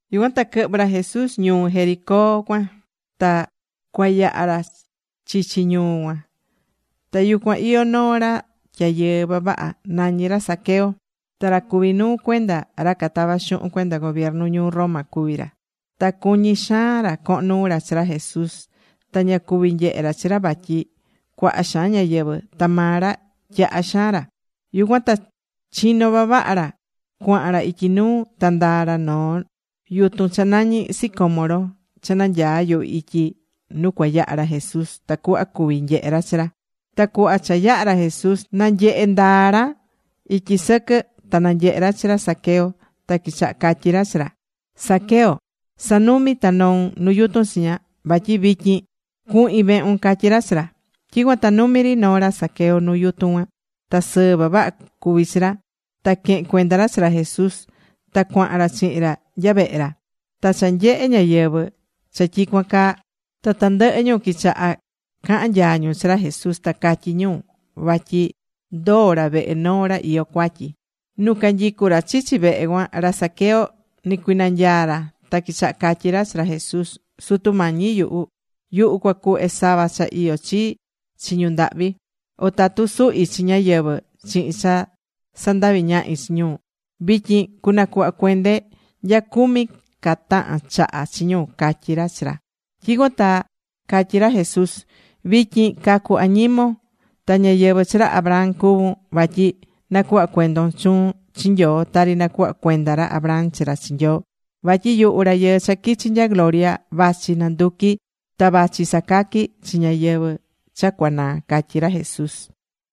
Yucuan ta quɨhvɨ̱ ra Jesús ñuu Jericó cuan. Ta cua yaha ra chichi ñuu cuan. Ta yucuan iyó noo ra tyayɨɨ vavaha. Nañí ra Zaqueo. Ta ra cuví nuu cuenda ra catava xuhun cuenda gobiernu ñuu Roma cuví ra. Ta cuñí xaan ra cohon nuu ra chi ra Jesús. Ta ña cuví nyehe ra chi ra vatyi cuaha xaan ñáyɨvɨ. Ta maa ra tyaha xaan ra. Yucuan ta chino vavaha ra cuahan ra ityi nuu, ta ndaa̱ ra nu noo yutun cha nañí sicómoro cha nanyaá yuhu ityi nu cua yaha ra Jesús, tacuhva cuvi nyehe ra chi ra. Ta cuhva cha yaha̱ ra Jesús nanyehé ndaa ra ityi sɨquɨ ta nanyehe ra chi ra Zaqueo. Ta quichaha catyí ra chi ra: ―Zaqueo, sa̱numi ta no̱un nu yutun chiña. Vatyi vityin cuhin vehun ―catyí ra chi ra. Tyicuan ta numi ri noo̱ ra Zaqueo nuu yutun cuan. Ta sɨɨ vavaha cuví chi ra. Ta quehe̱n cuenda ra chi ra Jesús. Ta cuahan ra chihin ra nya vehe ra. Ta cha nyehe̱ ñáyɨvɨ cha tyicuan caa, ta tandɨhɨ ñu quichaha cahán nyaa ñu chi ra Jesús. Ta catyí ñu vatyi ndoo̱ ra vehe noo ra iyó cuatyi. Nu canyicú ra chichi vehe cuan, ra Zaqueo nɨcuinanyaa̱ ra. Ta quichaha catyí ra chi ra Jesús: ―Sutu Mañi yuhu, yuhu cua cuhve sava cha iyó chii chi ñu ndahvi. O tatu suhi chi ñáyɨvɨ chihin cha sandavi ñahi chi ñu, vityin cunacuhva cuende nya cumi ca tahan chaha chi ñu ―catyí ra chi ra. Tyicuan ta catyí ra Jesús: ―Vityin cacu añimon, ta ñáyɨvɨ chi ra Abraham cuvún. Vatyi nacuhva cuendon chuun chi Nyoo tari nacuhva cuenda ra Abraham chi ra chi Nyoo. Vatyi yuhu Rayɨɨ cha quichi̱ nya gloria vachi nanduqui ta vachi sacaqui chi ñáyɨvɨ cha cua naa ―catyí ra Jesús.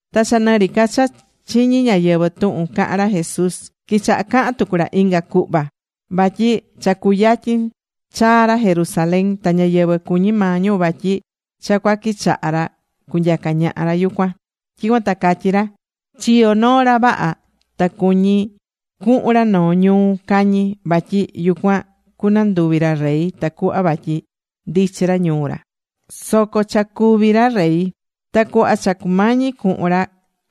Ta cha nɨ ri ca cha chiñí ñáyɨvɨ tuhun cahán ra Jesús, quichaha cahan tucu ra inga cuhva ihya. Vatyi cha cuyatyin chaa ra Jerusalén. Ta ñáyɨvɨ cuñí maa ñu vatyi cha cua quichaha ra cunyaca ñaha ra yucuan. Tyicuan ta catyí ra: ―Chiyo noo ra vaha ta cuñí cuhun ra noo ñuu cañi. Vatyi yucuan cunanduvi ra rey tacuhva vatyi ndichi ra ñuu ra, soco cha cuví ra rey. Ta cuhva cha cumañi cuhun ra,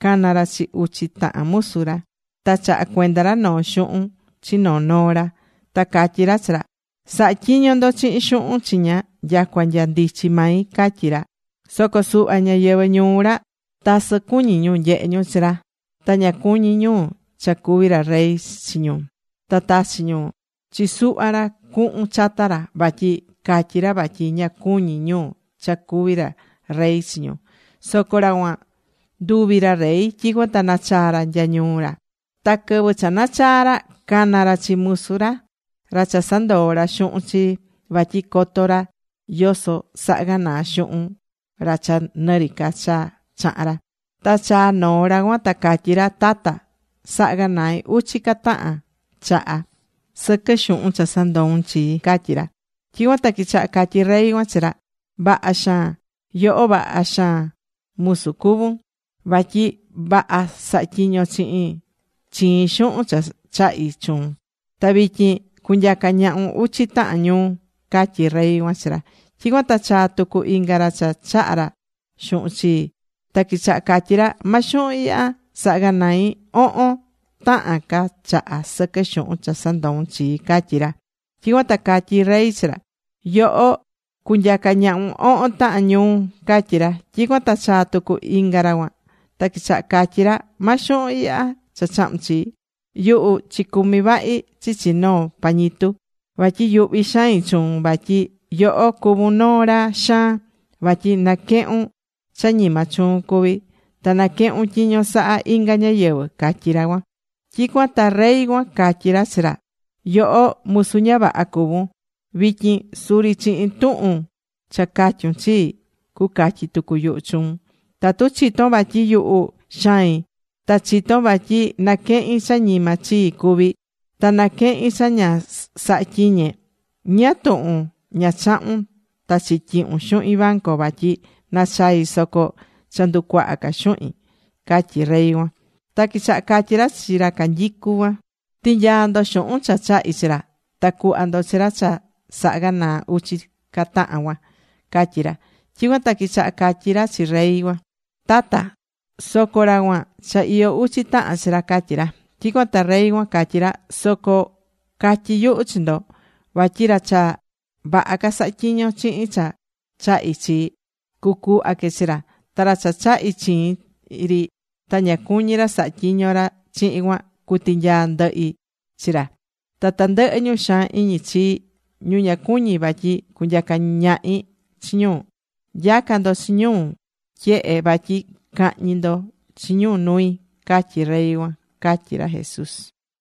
cana̱ ra chi uchi tahan musu ra. Ta chaha̱ cuenda ra noo xuhun chi noo noo ra. Ta catyí ra chi ra: “Sa̱ha tyiño ndo chihin xuhun chiña nyacua nya ndichi mai”, catyí ra. Soco suhva ñáyɨvɨ ñuu ra, tasɨ cuñí ñu nyehe ñu chi ra ta ña cuñí ñu cha cuví ra rey chi ñu. Ta tachi̱ ñu chi suhva ra cuhun chata ra, vatyi catyi ra vatyi ña cuñí ñu cha cuví ra rey chi ñu. Soco ra cuan nduvi̱ ra rey. Tyicuan ta nachaa̱ ra nya ñuu ra. Ta quɨvɨ cha nachaa̱ ra, cana̱ ra chi musu ra, ra cha sandoo̱ ra xuhun chii. Vatyi coto ra yoso saha̱ ganaa xuhun ra cha nɨ ri ca cha chaha̱n ra. Ta chaa̱ noo ra cuan. Ta catyí ra: “Tata, saha̱ ganai uchi ca tahan chaha sɨquɨ xuhun cha sandou̱n chii”, catyí ra. Tyicuan ta quichaha catyí rey cuan chi ra: “Vaha xaan. Yoho vaha musu cuvún. Vatyi vaha saha̱ tyiñon chihin chiin xuhun cha chahi̱ chuun. Ta vityin cunyaca ñahun uchi tahan ñuu”, catyí rey cuan chi ra. Tyicuan ta chaa̱ tucu inga ra cha chaha̱ ra xuhun chii. Ta quichaha catyí ra: “Ma xuhun ihya. Saha̱ ganai ohon tahan ca chaha sɨquɨ xuhun cha sandou̱n chii”, catyí ra. Tyicuan ta catyí rey chi ra: “Yoho cunyaca ñahun ohon tahan ñuu”, catyí ra. Tyicuan ta chaa̱ tucu inga ra cuan. Ta quichaha catyi ra: “Ma xuhun ihya cha chahu̱n chii. Yuhu chicumi̱ vahi chichi noo pañitu. Vatyi yuhví xain chuun, vatyi yoho cuvún noo ra xaan. Vatyi naquehun cha ñima chuun cuví. Ta naquehun tyiño saha inga ñáyɨvɨ”, catyí ra cuan. Tyicuan ta rey cuan catyí ra chi ra: “Yoho musu ña vaha cuvún. Vityin suri chihin tuhun cha catyun chii, cucatyi tucu yuhu chuun. Tatu chitón vatyi yuhu, xain, ta chitón vatyi naquehin cha ñima chii cuví, ta naquehín cha ña saha̱ tyiñe, ¿ñáá tuhun ña chahu̱n ta chityihu̱n xuhin banco vatyi nachai soco cha nducuaha ca xuhin?” catyí rey cuan. Ta quichaha catyí ra chi ra canyicú cuan: “Ti̱nyaa ndo xuhun cha chahi̱ chi ra, ta cu̱hva ndo chi ra cha saha ganaa uchi ca tahan cuan”, catyí ra. Tyicuan ta quichaha catyi ra chi rey cuan: “Tata, soco ra cuan, cha iyó uchi tahan chi ra”, catyí ra. Tyicuan ta rey cuan catyí ra: “Soco catyi yuhu chi ndo. Vatyi ra cha vaha ca sahá tyiño chihin cha chahi̱ chi, cucuhva que chi ra. Ta ra cha chahi̱ chiin ri, ta ña cuñí ra sahá tyiño ra chihin cuan, cutinyaa ndɨhi chi ra. Ta tandɨhɨ ñu xaan iñi chii, ñu ña cuñí vatyi cunyaca ñahi chi ñu, nya̱ca ndo chi ñu tyehe vatyi cahñi ndo chi ñu nui”, catyí rey cuan ―catyí ra Jesús.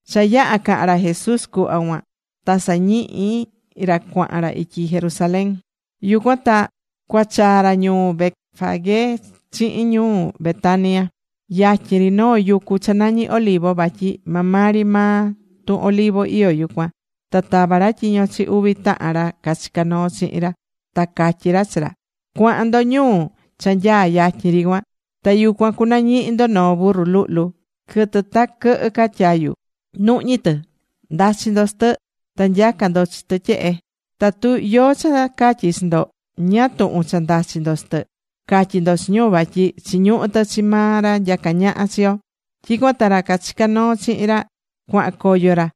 Cha yaha̱ cahan ra Jesús cuhva cuan, ta sañihi ra cuahan ra ityi Jerusalén. Yucuan ta cua chaa ra ñuu Betfagé chihin ñuu Betania, yatyin ri noo yucu cha nañi Olivo, vatyi maa maa ri maa tun Olivo iyó yucuan. Ta tava̱ ra tyiño chi uvi tahan ra cachicá noo chihin ra. Ta catyí ra chi ra: ―Cua̱han ndo ñuu cha nyaá yatyin ri cuan. Ta yucuan cunañihi ndo noo burru luhlu, quɨtɨ ta coto ca tyayu, nuhñí tɨ. Nda̱chi ndo chi tɨ. Ta nya̱ca ndo chi tɨ tyehe. Tatu yóó cha catyí chi ndo: “¿Ñáá tuhun cha ndachi ndo chi tɨ?” ca̱tyi ndo chi ñu: “Vatyi chiñuhú tɨ chi maa ra nyaca ñaha chi yo.” Tyicuan ta ra cachicá noo chihin ra, cuahan coyo ra.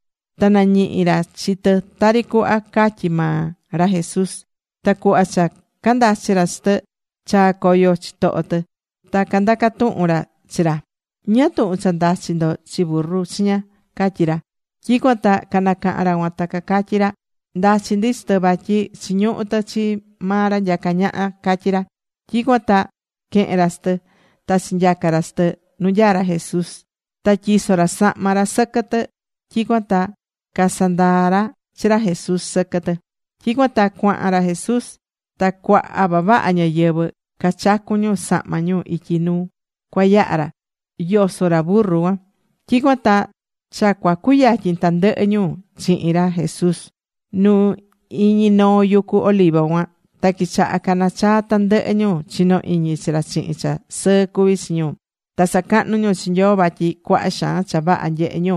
Ta nañihi̱ ra chi tɨ tari cuhva catyí maa ra Jesús. Ta cuhva cha candachi ra chi tɨ, chaa̱ coyo chitoho tɨ. Ta candaca tuhun ra chi ra: ―¿Ñáá tuhun cha ndachi ndo chi burru chiña? ―catyí ra. Tyicuan ta canacaha̱n ra cuan ta cacatyi ra: ―Ndachí ndi chi tɨ vatyi chiñuhú tɨ chi maa ra nyacá ñaha ―catyí ra. Tyicuan ta quehe̱n ra chi tɨ. Ta chinyaca̱ ra chi tɨ nu nyaá ra Jesús. Ta tyiso̱ ra sahma ra sɨquɨ tɨ. Tyicuan ta casandaa̱ ra chi ra Jesús sɨquɨ tɨ. Tyicuan ta cuahan ra Jesús. Ta cuaha vavaha ñáyɨvɨ cachacu̱n ñu sahma ñu ityi nu cua yaha ra, yosó ra burru cuan. Tyicuan ta cha cua cuyatyin tandɨhɨ ñu chihin ra Jesús nu iñi noo yucu Olivo cuan. Ta quichaha cana̱ chaa tandɨhɨ ñu chinó iñi chi ra chihin cha sɨɨ cuví chi ñu. Ta sacahnú ñu chi Nyoo vatyi cuaha xaan cha vaha nyehe̱ ñu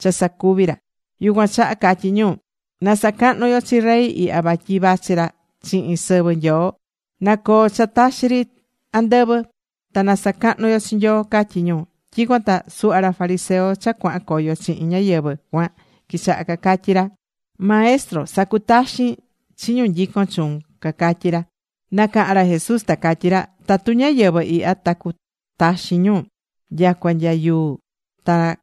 cha sacuvi̱ ra. Yucuan chaha catyí ñu: ―¡Na sacahnu yo chi Rey ihya vatyi vachi ra chihin sɨvɨ Nyoo! ¡Na coo cha taxi ri andɨvɨ! ¡Ta na sacahnu yo chi Nyoo! ―catyí ñu. Tyicuan ta suhva ra fariseo cha cuahan coyo chihin ñáyɨvɨ cuan quichaha cacatyi ra: ―Maestro, sa̱cutaxin chi ñu nyicón chuun ―cacatyí ra. Nacaha̱n ra Jesús ta catyí ra: ―Tatu ñáyɨvɨ ihya ta cu taxin ñu, nyacua nya yuu ta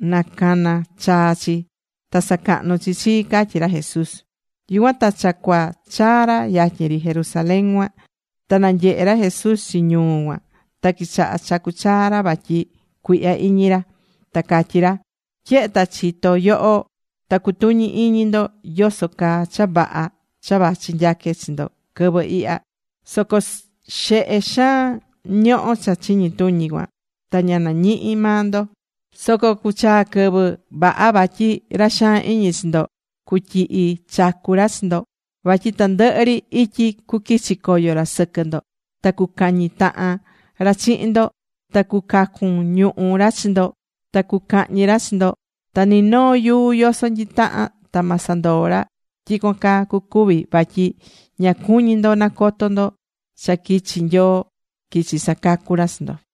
nacana chaa chi, ta sacahnu chi chii ―catyí ra Jesús. Yucuan ta cha cua chaa ra yatyin ri Jerusalén cuan. Ta nanyehe ra Jesús chi ñuu cuan ta quichaha chacu chaa ra vatyi cuihya iñi ra. Ta catyí ra: ―Tyehe ta chitó nyoho, ta cutuñi iñi ndo yoso caa cha vaha cha vachi nyaque chi ndo quɨvɨ ihya. Soco xehe xaan ñohó cha chiñi tuñi cuan, ta ña nañihí maa ndo. Soco cuchaa quɨvɨ ña vaha vatyi ra xaan iñi chi ndo cutyihi chacu ra chi ndo. Vatyi tandɨhɨ ri ityi cuquichi coyo ra sɨquɨ ndo. Ta cucañi tahan ra chihin ndo. Ta cucacun ñuhú ra chi ndo ta cucahñi ra chi ndo. Ta ni noo yuu yoso nyitahan ta ma sandoo ra. Tyicuan caa cucuvi vatyi ña cuñí ndo nacoto ndo cha quichi̱ Nyoo quichi sacacu ra chi ndo.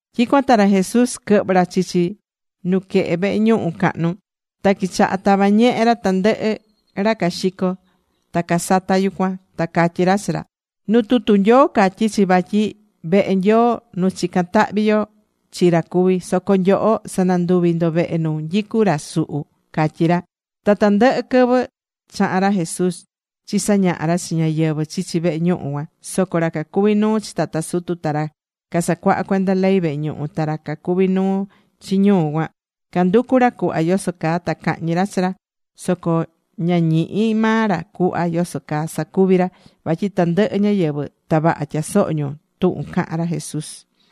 Tyicuan ta ra Jesús quɨhvɨ̱ ra chichi nuquehe vehe ñuhu cahnu. Ta quichaha tava ñehe ra tandɨhɨ ra caxicó ta casatá yucuan. Ta catyí ra chi ra: ―Nu tutu Nyoo catyí chi vatyi vehe Nyoo, nu chicán tahvi yo chi ra cuví. Soco nyoho sananduvi̱ ndo vehe nu nyicú ra suhu ―catyí ra. Ta tandɨhɨ quɨvɨ chahán ra Jesús chisañaha ra chi ñáyɨvɨ chichi vehe ñuhu cuan. Soco ra cacuví nuu chi tata sutu, ta ra casacuahá cuenda ley vehe ñuhu, ta ra cacuví nuu chi ñuu cuan, canducú ra cuhva yoso caa ta cahñi ra chi ra. Soco ña ñihí maa ra cuhva yoso caa sacuvi ra. Vatyi tandɨhɨ ñáyɨvɨ ta vaha tyasohó ñu tuhun cahán ra Jesús.